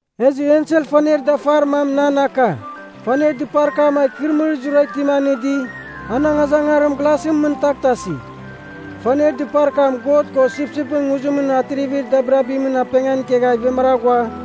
Ezɨ ensel faner dafar mam nan aka, faner dɨpar kam a ikɨrɨmɨrir zurara itim anɨdi, an angazangarim glasɨn mɨn taghtasi. Faner dɨpar kam God ko Sipsipɨn Nguzimɨn atrivir dabirabimɨn apengan ikegha ivemara ghua,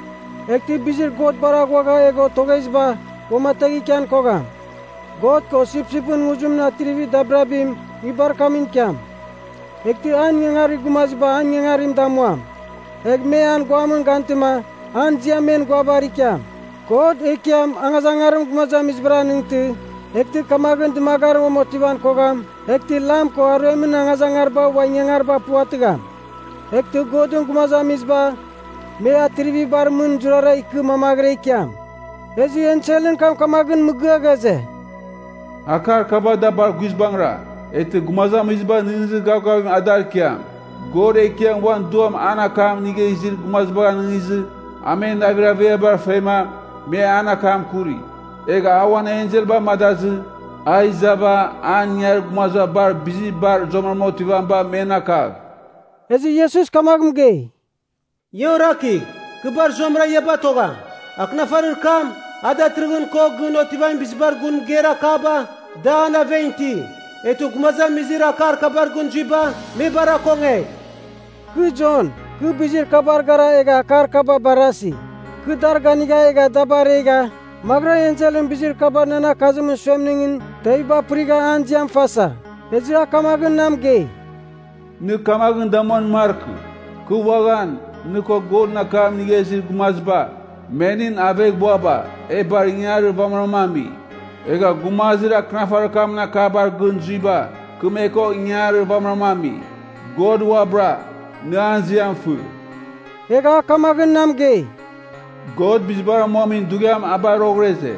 Eghtɨ bizir God bar aghuagha egha otogheziba, uamategh ikian kogham. God ko Sipsipɨn Nguzimɨn atrivir dabirabim, nguibar kamɨn ikiam. Eghtɨ an ingangarir gumaziba an ingangarim damuam. Egh me an guamɨn gantɨma, an ziam men guabar ikiam. God, Ekiam angazangarim gumazamizibar anɨngtɨ, eghtɨ kamaghɨn dɨmagarim uam otivan kogham eghtɨ lam ko aruemɨn angazangariba ua ingangariba puvatɨgham. Eghtɨ Godɨn gumazamiziba, me atrivibar mɨn zurara ikɨ mamaghɨra ikiam. Ezɨ enselɨn kam kamaghɨn mɨgɨa ghaze, “Akar kaba da bar guizbangɨra, eghtɨ gumazamiziba nɨghnɨzir gavgavim adar ikiam. God Ekiam uan Duam an akam inigha izir gumazibagh anɨngizɨ, a men navir averiaba fema, me an akam akuri. Egh a uan ensel amadazɨ, a izava an ingangarir gumaziba bar bizir bar zuamɨrama otivamiba men akagh.” Ezɨ Iesus kamagh mɨgei, “Ia orakigh, Kɨ bar zuamɨra ia batogham. Akɨnafarir kam, a datɨrɨghɨn ko gɨn otivamin bizibar gun mɨgeir akaba, da an aven iti. Eghtɨ gumazamizir akar kabar gɨn zuiba, me bar akongegh!” Kɨ Jon, kɨ bizir kabar gara egha akar kaba barasi. Kɨ dar ganigha egha da baregha, maghɨra enselɨn bizir kaba nan akazimɨn suemningɨn teviba apɨrigha an ziam fasa. Ezɨ a kamaghɨn na mɨgei, “Nɨ kamaghɨn damuan markɨ! Kɨ uaghan, nɨ ko Godɨn akam inigha izir gumaziba, me nɨn aveghbuaba, e bar ingangarir vamɨram ami. Egha gumazir akɨnafarir kamɨn akabar gɨn zuiba, kɨ me ko ingangarir vamɨram ami. God uabɨra, nɨ an ziam fɨ!” Egha a kamaghɨn na mɨgei, “God bizibar amuamin dughiam a bar roghɨra ize.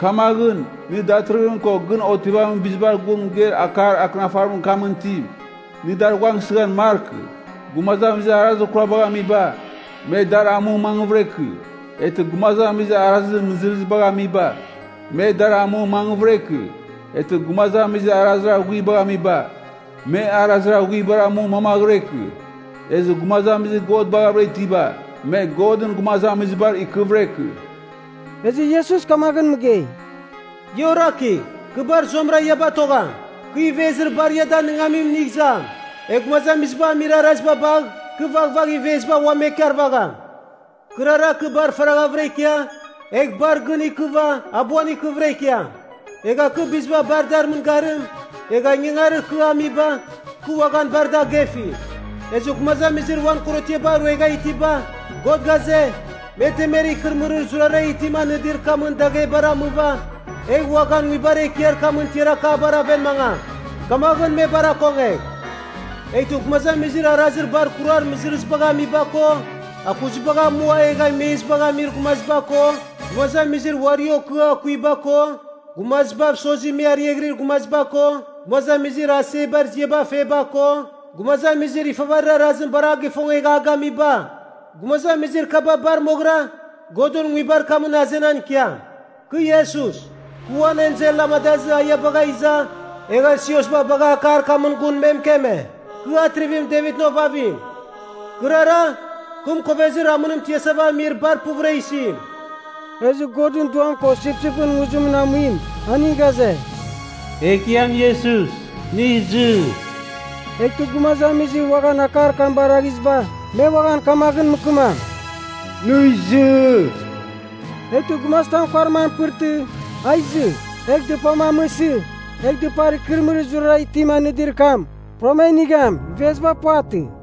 Kamaghɨn, nɨ datɨrɨghɨn ko gɨn otivamin bizibar gun mɨgeir akar akɨnafarir kamɨn itim, nɨ dar ghuangsɨghan markɨ. Gumazamizir arazir kurabagh amiba, me dar amu mangvɨra ikɨ. Eghtɨ gumazamizir arazir mɨzɨrɨzibagh amiba, me dar amu mangvɨra ikɨ. Eghtɨ gumazamizir arazir aghuibagh amiba, me arazir aghuibar amu mamaghɨra ikɨ. Ezɨ gumazamizir God baghavɨra itiba, me Godɨn gumazamizibar ikɨvɨra ikɨ.” Ezɨ Iesus kamaghɨn mɨgei, “Ia orakigh, kɨ bar zuamɨra ia batogham. Kɨ ivezir bar ia danɨngamim inigh izam. Egh gumazamiziba amir araziba bagh, kɨ vaghvagh iveziba ua me ikarvagham. Kɨrara kɨ bar faraghavɨra ikia egh bar gɨn ikɨva abuan ikɨvɨra ikiam. Egha kɨ biziba bar dar mɨngarim, egha ingangarir kɨ amiba kɨ uaghan bar da agefi. “Ezɨ gumazamizir uan korotiaba ruegha itiba, God ghaze, me temer ikɨrɨmɨrir zurara itim anɨdir kamɨn daghebar amɨva, egha uaghan nguibar ekiar kamɨn tiar akabar aven mangam. Kamaghɨn me bar akongegh. Eghtɨ gumazamizir arazir bar ikurar mɨzɨrɨzibagh amiba ko, akuzibagh amua egha imezibagh amir gumaziba ko, gumazamizir uari okɨa akuiba ko, gumazibav sozi me ariaghɨrir gumaziba ko, gumazamizir asebar ziaba feba ko, gumazamizir ifavarir arazim bar a gifongegha a gamiba, gumazamizir kaba bar moghɨra Godɨn nguibar kamɨn azenan ikiam. “Kɨ Iesus, kɨ uan ensel amadazɨ a ia bagha iza, egha siosba bagha akar kamɨn gun me mɨkeme. Kɨ Atrivim Devitɨn ovavim. Kɨrara, kɨ mɨkovezir amɨnim tiasava amir bar puvɨra isim.” Ezɨ Godɨn Duam ko Sipsipɨn Nguzimɨn amuim aning ghaze, “Ekiam Iesus, nɨ izɨ!” Eghtɨ gumazamizir uaghan akar kam baraghiziba, me uaghan kamaghɨn mɨkɨmam, “Nɨ izɨ!” Eghtɨ gumazitam kuarim an apɨrtɨ, a izɨ. Egh dɨpam amɨsɨ, egh dɨpar ikɨrɨmɨrir zurara itim anɨdir kam, puram a inigham, iveziba puvatɨ.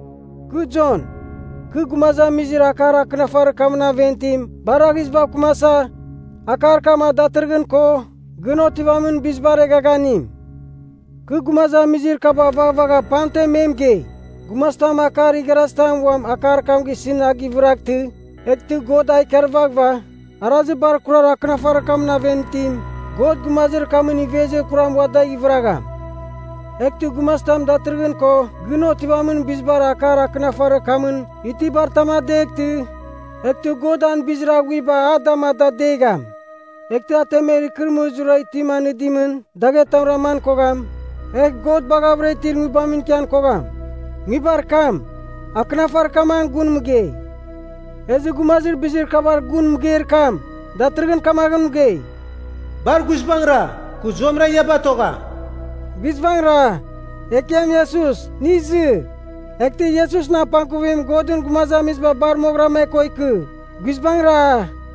Kɨ Jon, kɨ gumazamizir akar akɨnafarir kamɨn aven itim baraghizibav kɨmasa, akar kam a datɨrɨghɨn ko gɨn otivamin bizibar eghaghanim. Kɨ gumazamizir kaba vaghvagha pamtem me mɨgei, “Gumazitam akar igharazitam uam akar kam gisɨn a gɨvɨraghtɨ, eghtɨ God a ikarvaghɨva, arazir bar kurar akɨnafarir kamɨn aven itim, God gumazir kamɨn ivezir kuram ua dagh ivɨragham. Eghtɨ gumazitam datɨrɨghɨn ko gɨn otivamin bizibar akar akɨnafarir kamɨn itibar tam adeghtɨ, eghtɨ God an bizir aghuiba a dam ada adegham. Eghtɨ a temer ikɨrɨmɨrir zurara itim anɨdimɨn daghetam raman kogham, egh God baghavɨra itir nguibamɨn ikian kogham. Nguibar kam, akɨnafarir kam an gun mɨgei.” Ezɨ Gumazir Bizir Kabar Gun Mɨgeir Kam, datɨrɨghɨn kamaghɨn mɨgei, “Bar guizbangɨra, kɨ zuamɨra ia batogham.” Guizbangɨra! Ekiam Iesus, nɨ izɨ! Eghtɨ Iesusɨn apangkuvim Godɨn gumazamiziba bar moghɨra me ko ikɨ. Guizbangɨra!